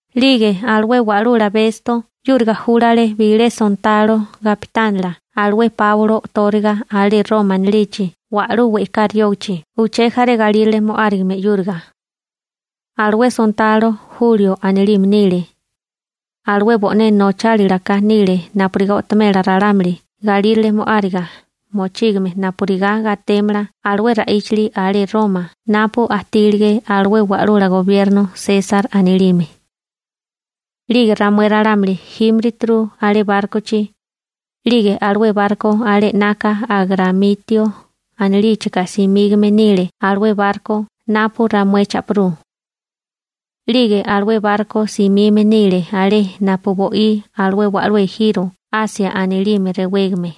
'Lige alué wa'lula Besto 'yúriga júlale bilé sontalo gapitánila alué Páulo o'tóriga alé Roma anilichi wa'lú we'ká riógichi uché jaré galírale mo'árigame 'yúriga. Alué sontalo Julio anilime nile. Alué bo'né nochálilaka nile napurigá o'tomela ralámuli galírale mo'áriga mochígame napurigá gatémala alué ra'íchili alé Roma napu ajtílige alué wa'lula gobierno Sesar anilime. 'Lige ramué ralámuli jímirituru alé bárkochi. 'Lige alué barko alé 'naka Agramitio anilíchika simígame nile alué barko napu ramué cha'pirú. 'Lige alué barko simime nile alé napu bo'í alué wa'lú ejiro Asia anilime rewégame.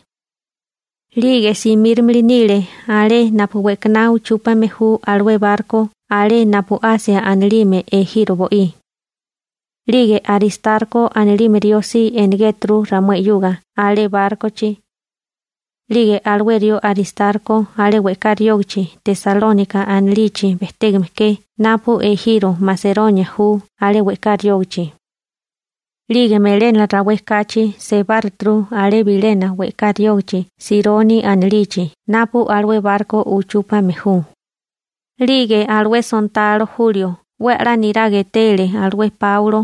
'Lige simíromili nile alé napu we'kaná uchúpame ju alué barko alé napu Asia anilime ejiro bo'í. 'Lige Aristarko anilime rió si enegéturu ramué 'yuga alé bárkochi. 'Lige alué rió Aristarko alé we'ká riógichi Tesalónika anilichi bejtégame ke napu ejiro Maseronia ju alé we'ká riógichi. 'Lige melénala rawé kachi sebáruturu alé bilena we'ká riógichi Sironi anilichi napu alué barko uchúpame ju, 'lige alué sontalo Julio 'we a'lá niraga etele alué Páulo,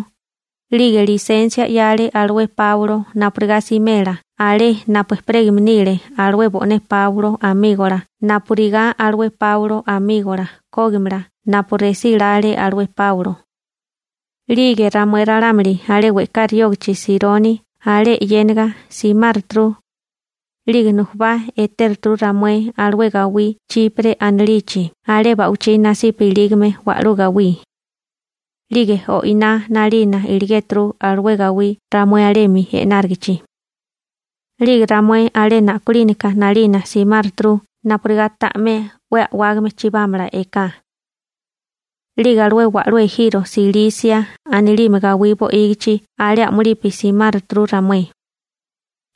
'lige lisensia 'yale alué Páulo napurigá simela alé napu ejperégame nile alué bo'né Páulo amígola napurigá alué Páulo amígola kógimala napu resí lále alué Páulo. 'Lige ramué ralámuli alé we'ká riógichi Sironi alé e'yéniga simáruturu, 'lige nujubá etéruturu ramué alué gawí Chipre anilichi alé ba'wichí nasipa ilígame wa'lú gawí. 'Lige o'iná 'nalina iligéturu alué gawí ramué alemi e'nárigichi. 'Lige ramué alé na'kolínaka 'nalina simáruturu napurigá ta'mé 'we a'wágame chibámala eká. 'Lige alué wa'lú ejiro Silisia anilime gawí bo'ígichi alé a'mulipi simáruturu ramué.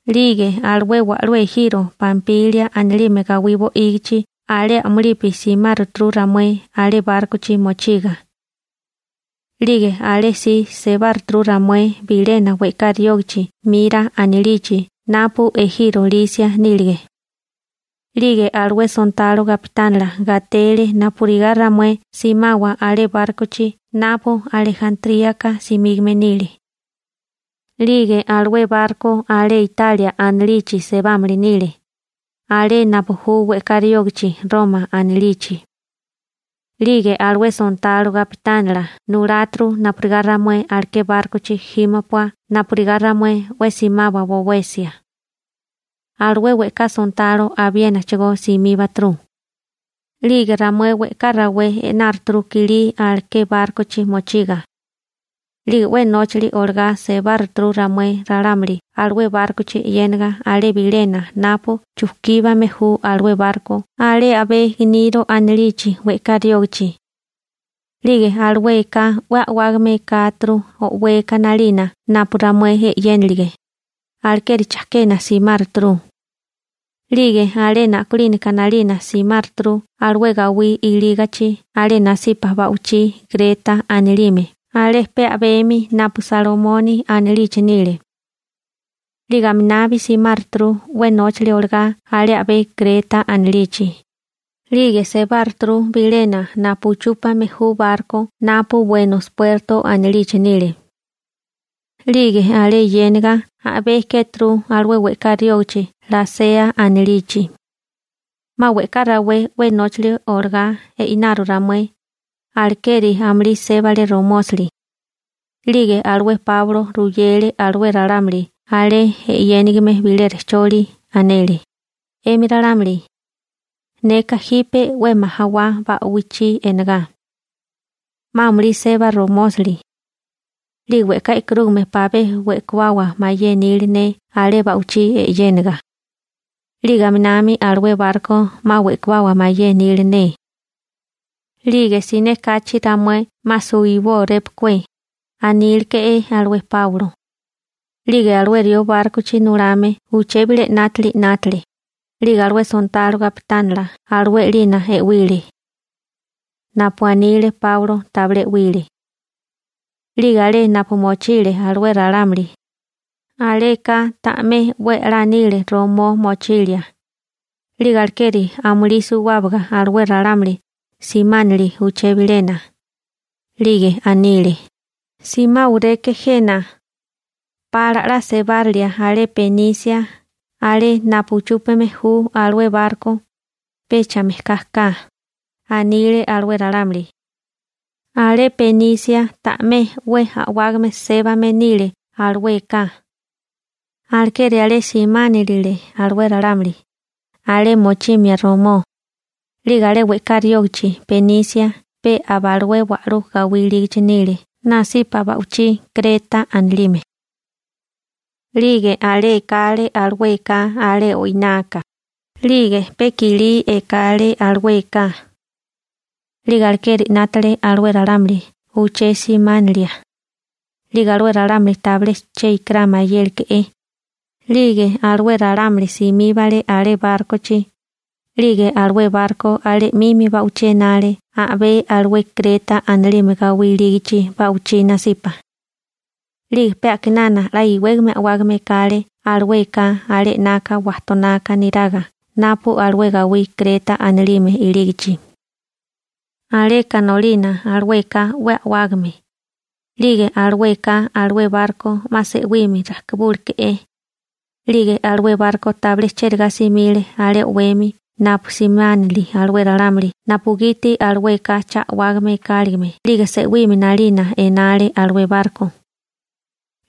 'Lige alué wa'lú ejiro Pampilia anilime gawí bo'ígichi alé a'mulipi simáruturu ramué alé bárkochi mochiga. 'Lige alé si sebáruturu ramué bilena we'ká riógichi Mira anilichi napu ejiro Lisia nílige. 'Lige alué sontalo gapitánila gatele napurigá ramué simawa alé bárkochi napu Alejantríaka simígame nile. 'Lige alué barko alé Italia anilichi sebámili nile, alé napu ju we'ká riógichi Roma anilichi. 'Lige alué sontalo gapitánila nuláturu napurigá ramué aleké bárkochi jímopua napurigá ramué 'we simawa bowesia. Alué we'ká sontalo abiénachigó simíbaturu. 'Lige ramué we'ká rawé e'náruturu kilí aleké bárkochi mochiga. 'Lige 'we nóchili olagá sebáruturu ramué ralámuli alué bárkochi e'yéniga alé bilena napu chukíbame ju alué barko alé a'bé Gniro anilichi we'ká riógichi. 'Lige alué eká 'we a'wágame ekáturu o'weka 'nalina napu ramué e'yénilige, alekeri chakena simáruturu. 'Lige alé na'kolínaka 'nalina simáruturu alué gawí ilígachi alé nasipa ba'wichí Kreta anilime alé pe a'bemi napu Salmoni anilichi nile. 'Lige aminabi simáruturu 'we nóchali olagá alé a'bé Kreta anilichi, 'lige sebáruturu bilena napu uchúpame ju barko napu Buenos Puertos anilichi nile. 'Lige alé yéniga a'bé kéturu alué we'ká riógichi Lasea anilichi. 'Ma we'ká rawé 'we nóchali olagá e'inaru ramué, alekeri amulí sébale romósali. 'Lige alué Páulo ruyele alué ralámuli alé e'yénigime bilé rejcholi. Anele: ―'Emi ralámuli, neka jipe 'we majawá ba'wichí e'nagá, 'ma amulí seba romósali. 'Lige we'ká e'karúgame pabé we'kawawa mayé nili ne alé ba'wichí e'yéniga. 'Lige aminami alué barko 'ma we'kawawa mayé nili ne. 'Lige siné kachi ramué 'ma suwibórépakué ―aníleke'é alué Páulo. 'Lige alué rió bárkochi nulame uché bilé 'nátili 'nátale, alué sontalo gapitánila alué 'lina e'wile. Napu anile Páulo tabilé e'wile. 'Lige alé napu mochile alué ralámuli, aleka ta'mé 'we a'lá nile romó mochilia. 'Lige alekeri amulí suwábaga alué ralámuli simánili uché bilena. 'Lige anile: ―Simáwaleké jena, pala 'la sebara ramué alé Benise alé napu uchúpame ju alué barko ―anile alué ralámuli. Alé Benise ta'mé 'we a'wágame sébame nile alué eká. Alekeri alé simánilile alué ralámuli, alé mochimia romó. 'Lige alé we'ká riógichi Benise pe aba alué wa'lú gawí ilígachi nile nasipa ba'wichí Kreta anilime. 'Lige a'lige ekale alué eká alé o'inaka, 'lige pe kilí ekale alué eká. 'Lige alekeri 'nátale alué ralámuli uché simánilia. 'Lige alué ralámuli tabilé che ikirá mayéleke'é. 'Lige alué ralámuli simíbale alé bárkochi, 'lige alué barko alé 'mimi ba'wichí enale a'bé alué Kreta anilime gawí ilígachi ba'wichí nasipa. 'Lige pe a'kinana 'la iwégame a'wágame ekale alué eká alé 'naka wajtonaka niraga napu alué gawí Kreta anilime ilígachi. Aleka nolina alué eká 'we a'wágame. 'Lige alué eká alué barko 'ma se'wimi rajkibúroleke'é. 'Lige alué barko tabilé chérigá simile alé o'wemi napu simánili alué ralámuli napugiti alué eká cha a'wágame ekáligime 'lige se'wimi 'nalina enale alué barko.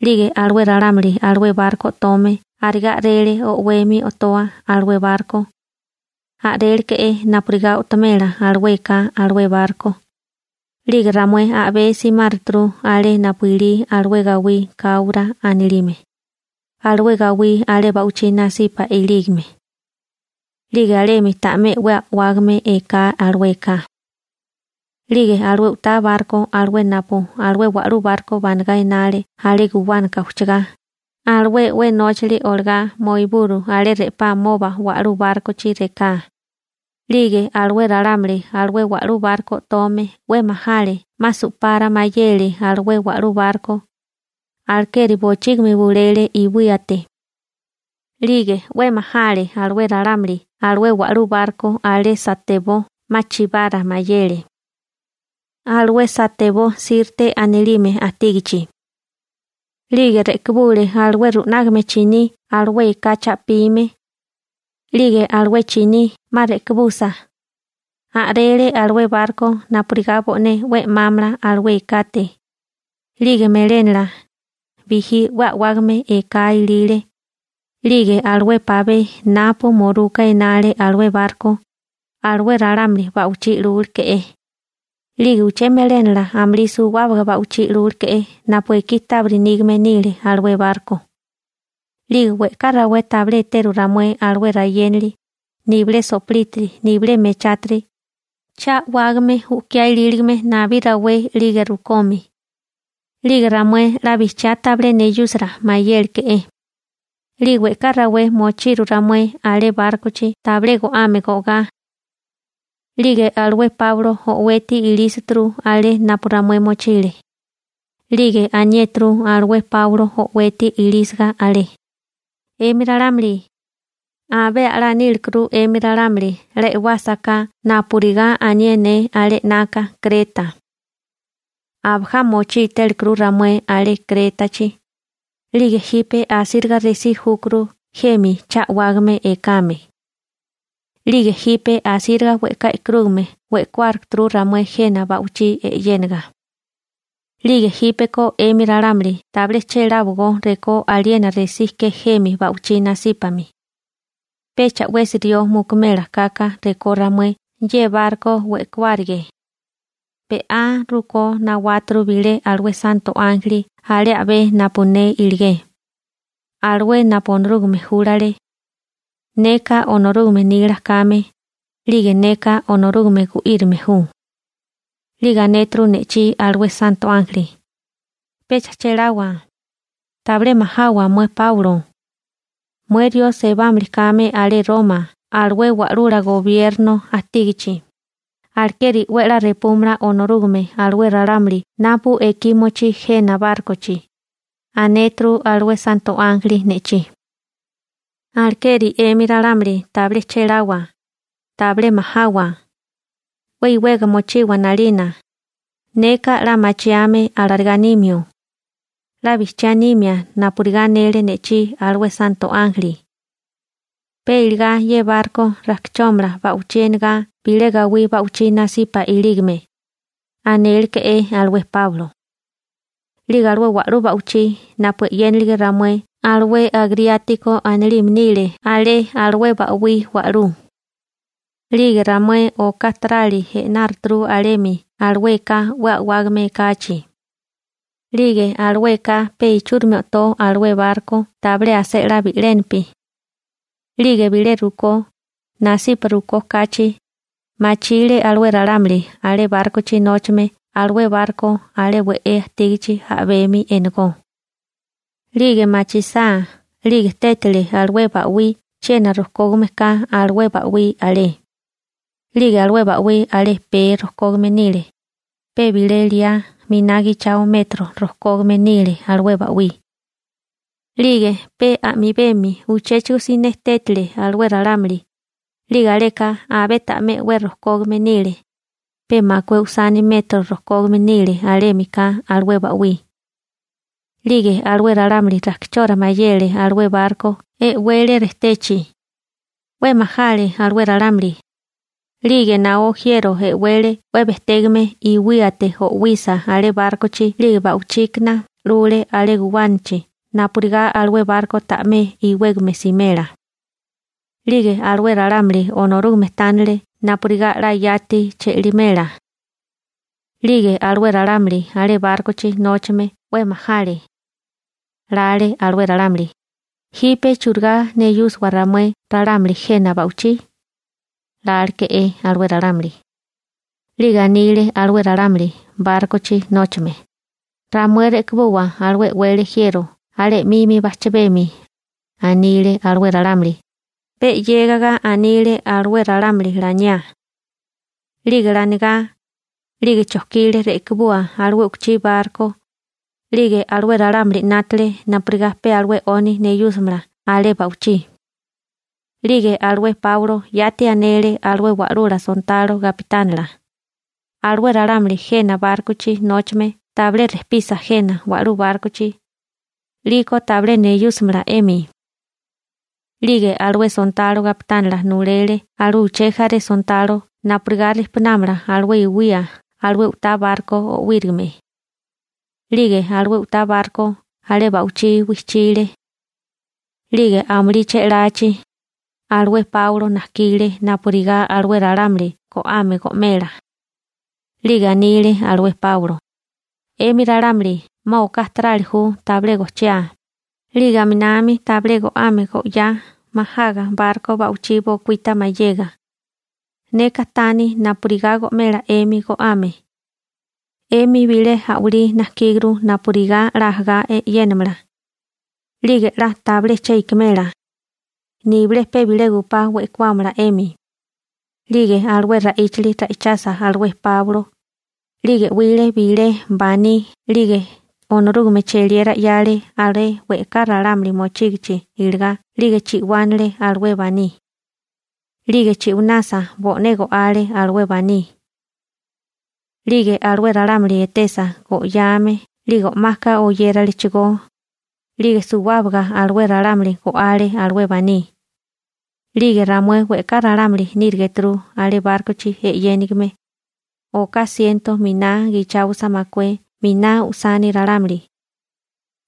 'Lige alué ralámuli alué barko o'tome arigá a'rele o'wemi o'toa alué barko. A'réleke'é napurigá o'tomela alué eká alué barko. 'Lige ramué a'bé simáruturu alé napu ilí alué gawí Káura anilime, alué gawí alé ba'wichí nasipa ilígame. 'Lige alemi ta'mé 'we a'wágame eká alué eká. 'Lige alué u'tá barko alué napu alué wa'lú barko banagá enale alé guwánaka ujchagá, alué 'we nóchili olagá moiburu alé re'pá amoba wa'lú bárkochi reká. 'Lige alué ralámuli alué wa'lú barko o'tome 'we majale 'ma su'para mayele alué wa'lú barko, alekeri bochígimi bulele iwíate. 'Lige 'we majale alué ralámuli alué wa'lú barko alé satebó 'ma chibara mayele. Alué satebó Sirte anilime ajtígichi. 'Lige re'kibule alué ru'nágame chiní alué eká cha'pime. 'Lige alué chiní 'ma re'kibusa, a'rele alué barko napurigá bo'né 'we 'mámala alué ekate. 'Lige melénala, bijí 'we a'wágame eká ilile. 'Lige alué pabé napu muruka enale alué barko, alué ralámuli ba'wichí 'lúleke'é. 'Lige uché melénala amulí suwábaga ba'wichí 'lúleke'é napu ekí tábiri nígame nile alué barko. 'Lige we'ká rawé tabilé eteru ramué alué rayénili, nibilé so'plítiri, nibilé mechátiri cha a'wágame u'kiá ilíligame nabí rawé 'lige rukomi. 'Lige ramué 'la bijchiá tabilé neyúsira mayéleke'é. 'Lige we'ká rawé mochiru ramué alé bárkochi tabilé go'ame go'gá. 'Lige alué Páulo o'weti ilísituru alé napu ramué mochile. 'Lige aniéturu alué Páulo o'weti ilísiga alé: ―'Emi ralámuli, abé a'lá nílikuru 'emi ralámuli 'la e'wásaká napurigá anié ne alé 'naka Kreta. Abajá mochí télikuru ramué alé Krétachi. 'Lige jipe asíriga resí júkuru jemi cha a'wágame ekame. 'Lige jipe asíriga we'ká e'karúgame we'kuárukuru ramué jena ba'wichí e'yénaga. 'Lige jípeko 'emi ralámuli tabilé chéláwagó rekó aliena resí ke jemi ba'wichí nasípami. Pecha 'wesi rió mukumela kaka rekó ramué ye barko we'kawárige. Be'á rukó nawáturu bilé alué santo ánjeli alé a'bé napu ne iligé, alué napu Onorúgame júlale. Neka Onorúgame nila kame, 'lige neka Onorúgame gu'írime ju. 'Lige anéturu ne'chí alué santo ánjeli: «Pecha chéláwa, tabilé majawa mué Páulo. Mué rió sebámili kame alé Roma alué wa'lula gobierno ajtígichi, alekeri 'we a'lá repúmala Onorúgame alué ralámuli napu ekí mochí jena bárkochi», anéturu alué santo ánjeli ne'chí. Alekeri 'emi ralámuli tabilé chéláwa, tabilé majawa. 'We iwega mochiwa 'nalina. Neka 'la machiame alarigá nímio. 'La bijchiá nimia napurigá anele ne'chí alué santo ánjeli. Pe iligá ye barko rakichómala ba'wichí enagá bilé gawí ba'wichí nasipa ilígame ―anéleke'é alué Páulo. 'Lige alué wa'lú ba'wichí napu e'yénilige ramué alué Agriátiko anilime nile alé alué ba'wí wa'lú. 'Lige ramué oká tarali e'náruturu alemi alué eká 'we a'wágame ekachi. 'Lige alué eká pe ichúrimi o'tó alué barko tabilé asé 'la bi'lénapi. 'Lige bilé rukó, nasipa rukó kachi, machile alué ralámuli alé bárkochi nóchame alué barko alé we'é ajtígichi a'bemi enagó. 'Lige machisá 'lige tétile alué ba'wí chiena rojkógame ka alué ba'wí alé. 'Lige alué ba'wí alé pee rojkógame nile, pe bilé liá miná gichao metro rojkógame nile alué ba'wí. 'Lige pe a'mibemi uchéchigo siné tétile alué ralámuli, 'lige aleka abé ta'mé 'we rojkógame nile, pe makué usani metro rojkógame nile alémika alué ba'wí. 'Lige alué ralámuli rakichora mayele alué barko e'wele rejtechi. 'We majale alué ralámuli. 'Lige naó jiero e'wele 'we bejtégame iwíate o'wisa alé bárkochi 'lige ba'wichíkana rajkibule alé guwánachi napurigá alué barko ta'mé iwégame simela. 'Lige alué ralámuli Onorúgame tánele napurigá 'la yati che'limela. 'Lige alué ralámuli alé bárkochi nóchame 'we majale. Lale alué ralámuli: «¿Jipe churigá neyúsiwa ramué ralámuli jena ba'wichí? 'Ma si'líporéko ramué», láleke'é alué ralámuli. 'Liko anile alué ralámuli bárkochi nóchame: ―Ramué rekibuwa alué e'wele jiero alé 'mimi bajchabemi ―anile alué ralámuli. Pe 'yégaga anile alué ralámuli laniá. 'Lige lanigá, chokile rekibua alué u'tá barko. 'Lige alué ralámuli 'nátale napurigá pe alué 'oni neyúsimala alé ba'wichí. 'Lige alué Páulo yati anele alué wa'lula sontalo gapitánila: ―Alué ralámuli jena bárkochi nóchame tabilé rejpisa jena wa'lú bárkochi, 'liko tabilé neyúsimala 'emi. 'Lige alué sontalo kapitánila nulele alué uché jaré sontalo napurigá rijpunámala alué iwía alué u'tá barko o'wírigime. 'Lige alué u'tá barko alé ba'wichí wijchile. 'Lige amulí che'lachi, alué Páulo najkile napurigá alué ralámuli go'ame go'mela. 'Lige anile alué Páulo: ―'Emi ralámuli 'ma oká tarali ju tabilé gojchiá, 'lige aminami tabilé go'ame go'yá majaga barko ba'wichí bokuíta mayega. Neka taní napurigá go'mela 'emi go'ame. 'Emi bilé a'walí najkíguru napurigá 'la ajagá e'yenámala. 'Lige 'la tabilé che ikimela, nibilé pe bilé gupá we'kuámala 'emi. 'Lige alué ra'íchili ra'ichasa alué Páulo, 'lige 'wile bilé baní 'lige Onorúgame cheliera 'yale alé we'ká ralámuli mochígichi iligá 'lige chi'wánale alué baní. 'Lige chi'winasa bo'né go'ale alué baní. 'Lige alué ralámuli etesa go'yame 'lige o'maka oyéralechigó, 'lige suwábaga alué ralámuli go'ale alué baní. 'Lige ramué we'ká ralámuli nírigeturu alé bárkochi e'yénigime. Oká siento miná gicháosa makué miná usani ralámuli,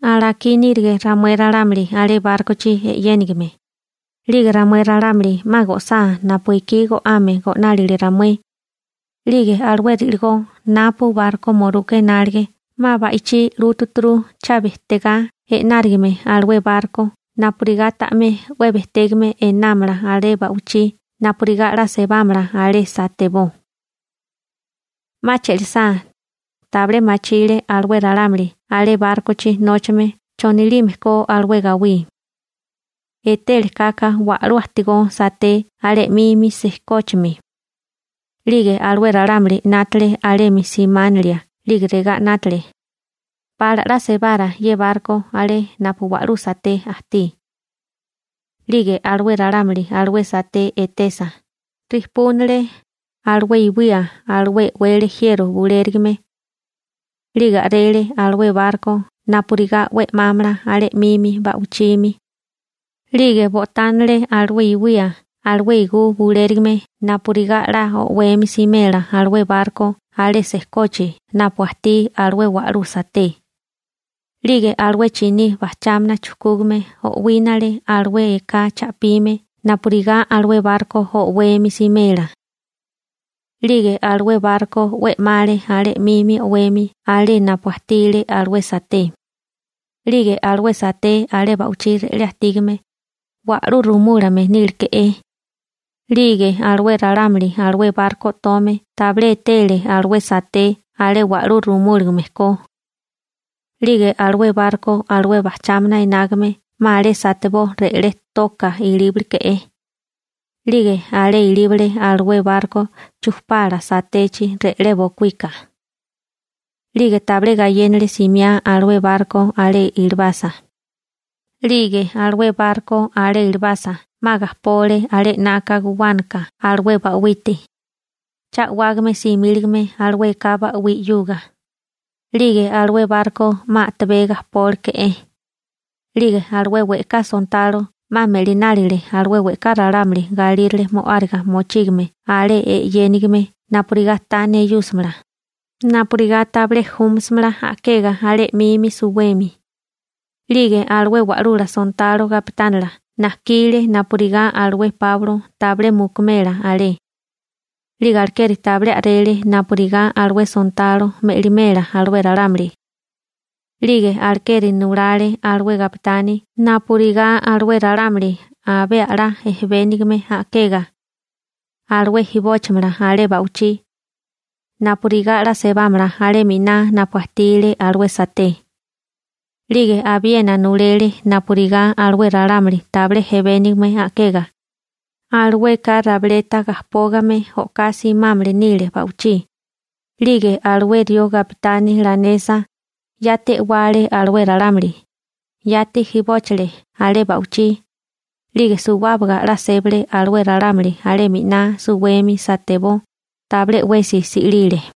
alakí nírige ramué ralámuli alé bárkochi e'yénigime. 'Lige ramué ralámuli 'ma go'sá napu ekí go'ame go'nálile ramué, 'lige alué ri'ligó napu barko muruka enálige 'ma ba'ichí 'lútuturu cha bejtegá e'nárigime alué barko napurigá ta'mé 'we bejtégame enámala alé ba'wichí napurigá 'la sebámala alé satebó. 'Ma che'lisá, tabilé machile alué ralámuli alé bárkochi nóchame chonilime ko alué gawí. Etele kaka wa'lú ajtigó saté alé 'mimi sijkóchimi. 'Lige alué ralámuli 'nátale alemi simánilia 'lige regá 'nátale: «Pala 'la sebara ye barko alé napu wa'lú saté ajtí.» 'Lige alué ralámuli alué saté etesa, rijpúnile alué iwía alué e'wele jiero bulérigame. 'Lige a'rele alué barko napurigá 'we 'mámala alé 'mimi ba'wichimi. 'Lige bo'tánale alué iwía alué igú bulérigame napurigá 'la o'wemi simela alué barko alé sekochi napu ajtí alué wa'lú saté. 'Lige alué chiní bajchámana chujkúgame o'wínale alué eká cha'pime napurigá alué barko o'wemi simela. 'Lige alué barko 'we 'male alé 'mimi o'wemi alé napu ajtile alué saté. 'Lige alué saté alé ba'wichí re'lé ajtígame, wa'lú rumúlame níleke'é. 'Lige alué ralámuli alué barko o'tome tabilé etele alué saté alé wa'lú rumúlagame ko. 'Lige alué barko alué bajchámana enágame 'ma alé satebó re'lé toka ilíbaleke'é. 'Lige alé ilíbale alué barko chujpala satechi re'lé bokuika. 'Lige tabilé gayénale simiá alué barko alé ilibasa. 'Lige alué barko alé ilibasa 'ma gajpole alé 'naka guwánaka alué ba'wite, cha a'wágame simíligame alué eká ba'wí 'yuga. 'Lige alué barko 'ma a'tabé gajpóleke'é. 'Lige alué we'ká sontalo 'ma me'linálile alué we'ká ralámuli galírale mo'áriga mochígame alé e'yénigime napurigá ta neyúsimala, napurigá tabilé júmasimala a'kega alé 'mimi suwemi. 'Lige alué wa'lula sontalo gapitánila najkile napurigá alué Páulo tabilé mukumela alé. 'Lige alekeri tabilé a'rele napurigá alué sontalo me'limela alué ralámuli. 'Lige alekeri nulale alué gapitani napurigá alué ralámuli abé a'lá ejebénigame a'kega, alué jibóchimala alé ba'wichí, napurigá 'la sebámala alé miná napu ajtile alué saté. 'Lige abiena nulele napurigá alué ralámuli tabilé ejebénigame a'kega, alueka rabileta gajpógame o'ká simámili nile ba'wichí. 'Lige alué rió gapitani lanesa, yati e'wale alué ralámuli, yati jibóchile alé ba'wichí. 'Lige suwábaga 'la sébale alué ralámuli alé miná suwemi satebó, tabilé 'wesi si'lile.